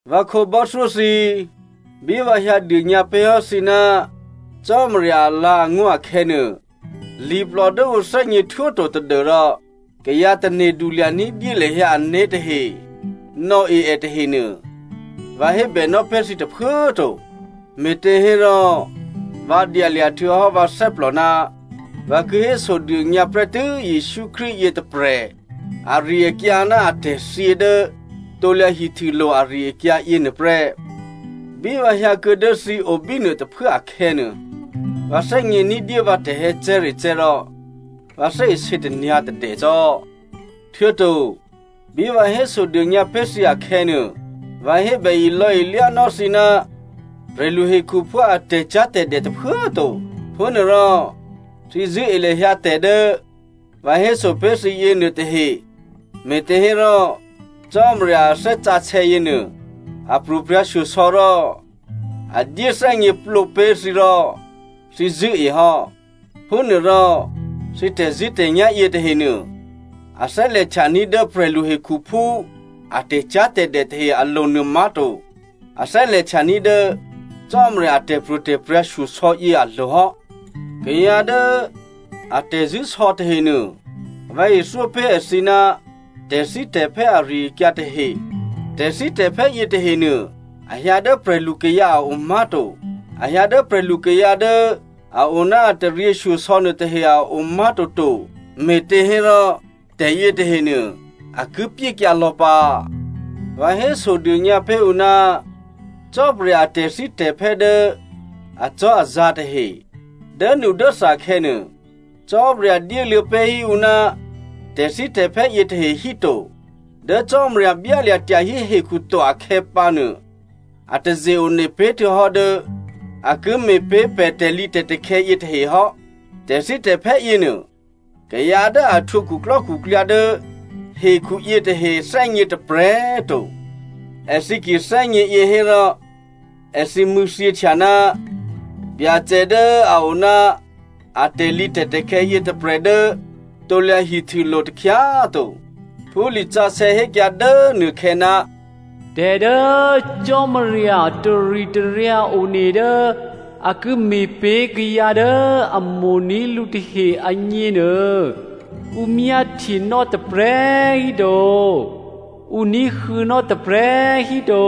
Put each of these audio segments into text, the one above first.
Vǎ khǒbò́thyó thǐ, bí vǎ hyǎ dônyǎ pé̤ hò́ thǐ ná Cò́marya alǎ̤angó̤ akhè̌nuô, liplò dố ǔ thè́gněhtwó to tadû́rò kayǎ tane̤du lya̤ ní̤dyé lahyǎ ané̤ tahe nò̌e è tahenuô, vǎ hébènò́ pé̤ thǐ tôphuố꤮ to. Me̤těhérò, vǎ dyalya̤ htuô̌hò́ vǎ thè́plò ná vǎ ki hésodônyǎ prè́tû́ Jesǔ Krístu yětôprè̤ ari-akyǎ ná atè̤thyě dố krusulo̤ ari-akyǎ yěnuô prè́. Bí vǎ hyǎ kuô̌ dố thǐ o bínuô tôphuố akhè̌nuô, vǎ thè́gně ní̤dyé vǎ tè̤hè̌cè̤́recè̤́ rò vǎ thè́isě tanyǎ̤tadè cò́. Htuô̌to bí vǎ hésodônyǎ pé̤ thǐ akhè̌nuô, vǎ hébè ilò̌-ilyánò́ thǐ ná prè̤lu hekhuphú a tè̤cyá̤tè̤dè tôphuố꤮ to. Manárò thǐ zṳ̂́e lahyǎ tè̤ dố vǎ héso pé̤ thǐ yěnuô tahe, me̤těhérò Cò́marya a Thè́ Sǎsè̌ yěnuô a pro̤prya̤shyosò̌ rò a dyéthè́gněplǒ pé̤ thǐ rò thǐ zṳ̂́e hò́. Phúnuôrò, thǐ tè̤zṳ̂́tè̤nyá̤ yětahenuô, a thè́lè̤htyaní̤ dố prè̤lu hekhuphú a tè̤cyá̤tè̤dè tahe alo̤ nuô má̤to. A thè́lè̤htyaní̤ dố Cò́marya a tè̤pro̤tè̤prya̤ shyosò̌ yě alo̤ hò́. Kayǎ dố a tè̤zṳ̂́sò̌ tahenuô, vǎ ithyó pé̤ èthǐ ná tè̤thítè̤phè́ ari-akyǎ tahe. Tè̤thítè̤phè́ yětahenuô, a hyǎ dố prè̤lukayǎ a o má̤to. A hyǎ dố prè̤lukayǎ dố a o ná a taryěshyosò̌ nuôtahe a o má̤toto. Me̤těhérò tè̤yětahenuô a ki pyékyǎ lò̌ pǎ. Vǎ hésodônyǎ pé̤ ǔ ná Cò́marya a tè̤thítè̤phè́ dố acò́azǎ̤ tahe. Dốnudốtha khè̌nuô, Cò́marya dyéluô̌ pé̤ hí ǔ ná tè̤thítè̤phè́ yětahe hí to. Dố꤮ Cò́marya byálya̤ tyahí hekhu to akhè̌ pǎnuô, a taze-one pé̤ htuô̌hò́ dố a ki me̤ pé̤ pè̤ tè̤lǐtè̤takhè̌ yětahe hò́. Tè̤thítè̤phè́ yěnuô, kayǎ dố a htwǒ khuklò́khuklyǎ dố hekhu yětahe thè́gně tôprè̤꤮ to. Èthǐ ki thè́gně yě hérò, èthǐ mṳ̂̌thyěhtya ná Byacè dố a o ná a tè̤lǐtè̤takhè̌ yětôprè̤ dố krusulo̤ takhyá꤮ to. Phú lisǎsè̌ hékyǎ dố nuôkhè̌, “Tè̤ dố Cò́marya taritaryǎ one dố a ki me̤ pé̤ kayǎ dố a mo̤ní̤ lǔ tahe agněnuô, ǔ myáhtyenò́ tôprè̤꤮ hí to, ǔ ní̤huô̌nò́ tôprè̤꤮ hí to,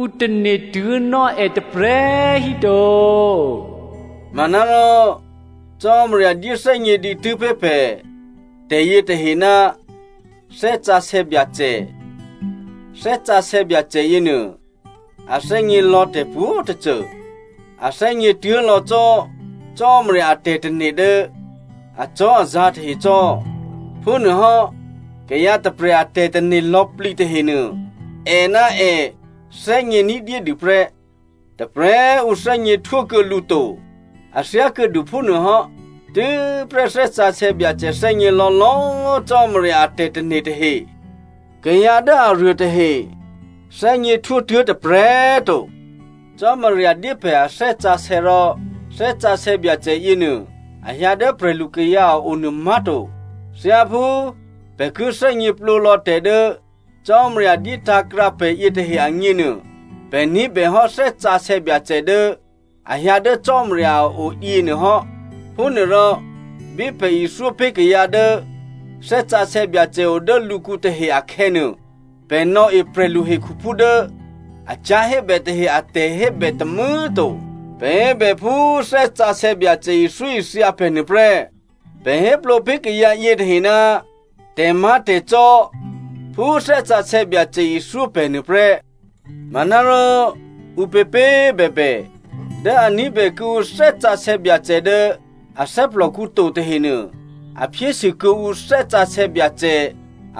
ǔ tane̤tuố̤nò́ è tôprè̤꤮ hí to.” Manárò, Cò́marya dyéthè́gně dǐtû́ pé̤ pè̤ tè̤yětahe ná Thè́ Sǎsè̌ Byacè. Thè́ Sǎsè̌ Byacè yěnuô a thè́gně lò̌ tè̤pwǒ̤tôcô. A thè́gně tuố̤ lò̌ cò́ Cò́marya a tè̤tane̤ dố acò́azǎ̤ tahe cò́. Phúnuôhò́, kayǎ tôprè̤ a tè̤tane̤ lò̌plǐ tahenuô, è ná è thè́gně ní̤dyédû prè́. Tôprè̤꤮ ǔ thè́gněhtwó kuô̌ lǔ to. A thyákuô̌dû phúnuôhò́, tû́prè́ Thè́ Sǎsè̌ Byacè thè́gně lò̌lò̌꤮ Cò́marya a tè̤tane̤ tahe. Kayǎ dố aruô tahe thè́gněhtwó tuố̤ tôprè̤꤮ to. Cò́marya dyé pè̤ a Thè́ Sǎsè̌, rò Thè́ Sǎsè̌ Byacè yěnuô, a hyǎ dố prè̤lukayǎ a o nuô má̤to. Thyáphú pè̤ ki thè́gněplǒ lò̌ tè̤ dố Cò́marya dyé tǎ̤krǎ pè̤ yětahe agněnuô, pè̤ ní̤bèhò́ Thè́ Sǎsè̌ Byacè dố a hyǎ dố Cò́marya a o yěnuô hò́. Phúnuôrò, bí pè̤ ithyó pé̤ kayǎ dố Thè́ Sǎsè̌ Byacè o dố lǔkǔ tahe akhè̌nuô, pè̤ nò̌e prè̤lu hekhuphú dố a cyá̤ hébè tahe a tè̤hébè tômû̌꤮ to. Pè̤ hébè phú Thè́ Sǎsè̌ Byacè ithyóithya pè̤ nuôprè́. Pè̤ héplǒ pé̤ kayǎ yětahe ná tè̤má̤tè̤cò́ phú Thè́ Sǎsè̌ Byacè ithyó pè̤ nuôprè́. Manárò ǔpěpě꤮ bèbè, dố a ní̤bè kuô̌ǔ Thè́ Sǎsè̌ Byacè dố a thè́plòkǔ to tahenuô, a phyésû kuô̌ǔ Thè́ Sǎsè̌ Byacè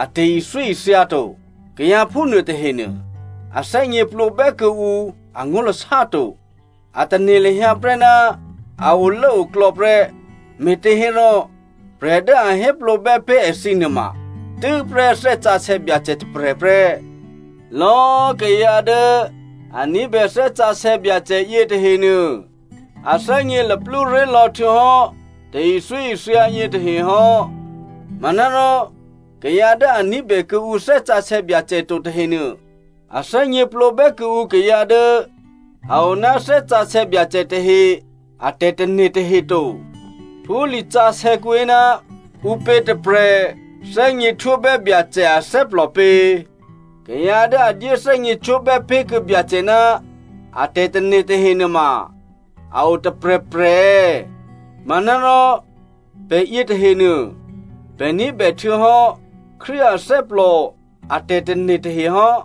a tè̤ithyóithya to. Kayǎ phúnuô tahenuô, a thè́gněplǒbè́ kuô̌ǔ angó̤lasá to, a tane̤ lahyǎ prè́ ná a olốoklò̌ prè́, me̤těhérò, prè̤ dố a héplǒbè́ pé̤ èthǐ nuôma tû́prè́ Thè́ Sǎsè̌ Byacè tôprè̤ prè́. Lò̌꤮ kayǎ dố a ní̤bè Thè́ Sǎsè̌ Byacè yětahenuô, a thè́gně luplú ré̤ lò̌ htuô̌hò́ tè̤ithyóithya yětahe hò́. Manárò kayǎ dố a ní̤bè kuô̌ǔ Thè́ Sǎsè̌ Byacè to tahenuô, a thè́gněplǒbè́ kuô̌ǔ kayǎ dố a o ná Thè́ Sǎsè̌ Byacè tahe a tè̤tane̤ tahe to. Phú lisǎsè̌kǔ hé, “Ǔpě tôprè̤ thè́gněhtwóbè́ Byacè athè́plò pě? Kayǎ dố a dyéthè́gněcwó̤bè́ pé̤ kuô̌ Byacè ná a tè̤tane̤ tahe nuôma a o tôprè̤prè̤ è̌?” Manárò pè̤ yětahenuô, pè̤ ní̤bè htuô̌hò́ Krístu athè́plò a tè̤tane̤ tahe hò́.